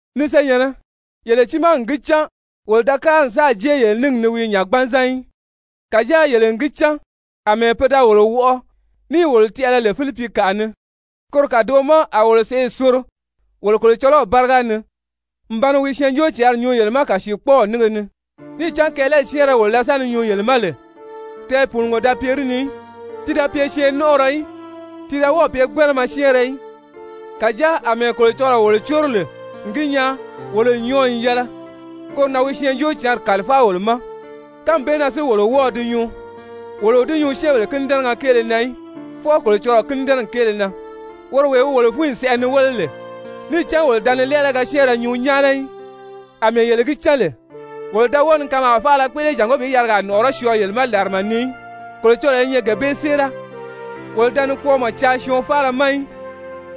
Ni senyɛ̀nnɛ, yele tiimaa n gi cán wolo da kári n sáà jée yele níngi ni wii nya gbanzan í. Kàjáa yele n gi cán àmɛɛ pe da wolo wɔʔɔ níì wolo tɛʔɛlɛ lè Filipikaʔa ni, koro kàdoʔo ma a wolo sèʔê soro wolo Kolocɔlɔw báriga ni n ba ni wi Syɛɛnjóocǎnri nyuu yele ma kàsiikpɔɔw nínge ni. Níì cán kɛɛlɛli syɛ́ɛnrɛ wolo da sa ni nyuu yele ma lè, tɛɛpùunugo da pye di ni í, ti da pye syɛɛnnɔnʔɔrɔ í, ti da wɔ́ɔ̀ pye gbánama syɛ́ɛnrɛ í. Kàjáa àmɛɛ Kolocɔlɔɔ wolo córo lè n gi nyaa wolo n nyɔɔ n yɛlɛ, koro na wi Syɛɛnjóocǎnri kàlifáa wolo ma, kánmi bee na si wolo wɔ́ɔ̄ di nyuu, wolo o di nyuu syɛ́ɛnbèle kínidɛnɛgɛ kéele na í, fwɔɔ Kolocɔlɔɔ kínidɛnɛgi kéele na, woro wee wi wolo fúnyi sɛʔɛ ni wéle lè. Níì cán wolo da ni lɛ́ɛlɛgɛ syɛ́ɛnrɛ nyuu nyáana í àmɛɛ yele gi cán lè. Wolo da wɔ́ɔ ni kanmaa faala kpéʔele jàngó bi yarigaa nɔ̀ʔɔrɔ́ syɔɔ yele ma làrama ni í, Kolocɔlɔɔ i nyɛ gee bee séera. Wolo da ni kpɔɔmɔ caa syɔɔn faala ma í,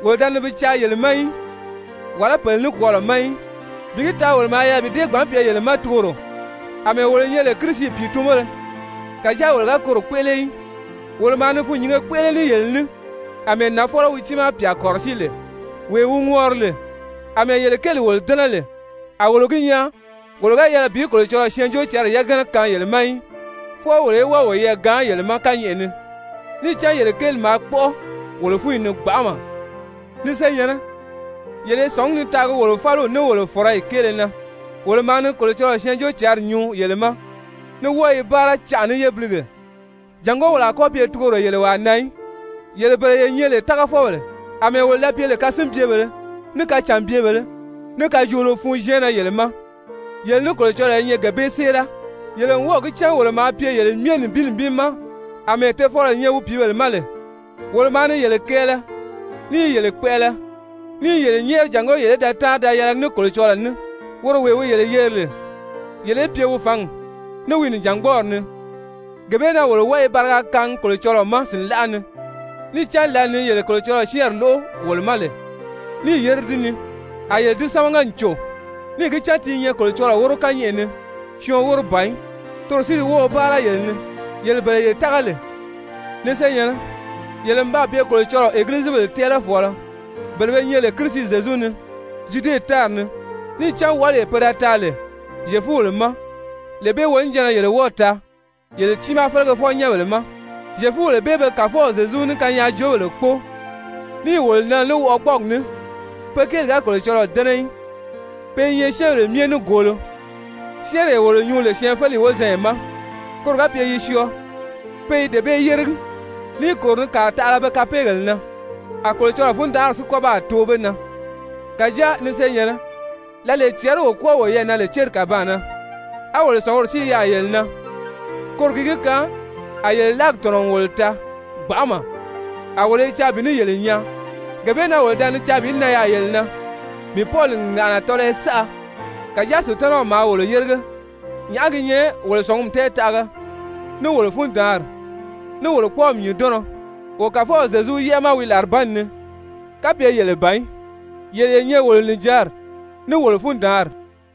wolo da ni bi caa yele ma í, wàlá pèle nikwɔɔlɔ ma í. Bi gi taa wolo maa yɛlɛ bi dée gbǎn pye yele ma tugoro àmɛɛ wolo nyɛ lè Kirisi pìitunbéle. Kàjáa wolo ga koro kpéʔele í. Wolo maa ni fûnnyinge kpéʔele ní yele ní àmɛɛ nafɔlɔ wi tiimaa pyà kɔ̀rɔsíi lè, wee wi ŋɔri lè. Amɛɛ yele kéeli wolo dɛ́nɛ lè, a wolo gi nyaa wolo ga yɛlɛ bi Kolocɔlɔɔ Syɛɛnjóocǎnri yagana kaan yele ma í, fwɔɔ wolo í wɔ́ɔ woyɛɛ gaan yele ma kányɛʔɛ ni, níì cán yele kéeli maa kpɔ́ʔɔ wolo fúnyi ni gbanʔama. Ni senyɛ̀nnɛ, yele i sɔ̀ngí ni taagi wolo fáliw, ní wolo fɔ̀rɔyi kéele na, wolo maa ni Kolocɔlɔɔ Syɛɛnjóocǎnri nyuu yele ma, ní wɔ́ɔ i báara canʔa ní yébilige jàngó wolo a kɔ́ pye tugoro yele wàa na í. Yele bele ye nyɛ lè tágafɔbèle, àmɛɛ wolo da pye lè kasinbyebèlē, ní kacànbyebèlē, ní kajoolo fun syɛɛnnɛ yele ma, yele ní Kolocɔlɔɔ i nyɛ gee bee séera. Yele n wɔ́ɔ̀ gi cán wolo maa pye yele myɛ nibin nibin ma àmɛɛ tofɔlɔ nyɛ wi pìíbèle ma lè. Wolo maa ni yele kɛɛlɛ ní i yele kpɛʔɛlɛ ní i yele nyɛ́ɛri jàngó yele í da táanri da yɛlɛgi ní Kolocɔlɔɔ ní, woro wee wi yele yeri lè yele í pye wi fǎngi, ní wi nìjangbɔɔri ni. Gee bee na wolo wɔ́ɔ i bariga kaangi Kolocɔlɔɔ ma sìnlaʔa ni, níì cán lǎli ni yele Kolocɔlɔɔ syɛ́ɛnri lóʔo wolo ma lè níì yére di ni, a yele di sámaga n cò, níì gi cán ti i nyɛ Kolocɔlɔɔ wóro kányɛʔɛ ni, syɔɔn wóro ban í, toro si di wɔ́ɔ̄ báara yele ni, yele bele ye tága lè. Ni senyɛ̀nnɛ, yele n baa pye Kolocɔlɔɔ Egilizibèle tɛ́ɛlɛfɔɔlɔ bele be nyɛ lè Kirisi Zyezu ni Zyude tári ni, níì cán wɔʔɔlee pe da taa lè Zyefubèle ma, lee bee wonijanna yele wɔ́ɔ̀ taa yele tiimaa felegefɔ-nyɛ́nbèle ma. Zyefubèle bee be Kàfɔw Zyezu ní kanyaajoobèle kpóo, níì wolo nɛnɛ ní wɔʔɔgbɔɔgi ní, pe kéeli ga Kolocɔlɔɔ dɛ́nɛ í, pe i nyɛ syɛ́ɛnbèle myɛ nígoolo. Syɛ́ɛnree wolo nyuu lè syɛɛnfeleyi wozanya ma koro ga pye yi syɔɔ, pe i dee bee yéregi, níì kòro ni kàa taʔala be kapeegèle na. A Kolocɔlɔɔ fundanʔari si kɔ́ baa too be na. Kàjáa, ni senyɛ̀nnɛ, lǎlee cɛɛri wo kwɔ́ɔ woyɛɛ na lè céri kàbaan na, á wolo sɔ̀nguri si i yaà yele na, koro gi gi kaan a yele láagi tɔ̀nɔ n wolo taa gbanʔama, a wolo i caa bi ní yele nyaa. Gee bee na wolo da ni caa bi nan yaà yele na, mii Pɔli n ŋàʔana tɔlɔyɔ saʔa, kàjáa Sutanaw maa wolo yérige. Nyàʔá gi nyɛ wolo sɔ̀ngumi tɛɛtaʔaga, ní wolo fundaanri, ní wolo kpɔ́ɔmi nyùndɔnnɔ wo Kàfɔw Zyezu yɛ́ʔɛ ma wi làribanni ni, kapye yele ban í? Yele ye nyɛ wolo nìjanri ní wolo fundaanri.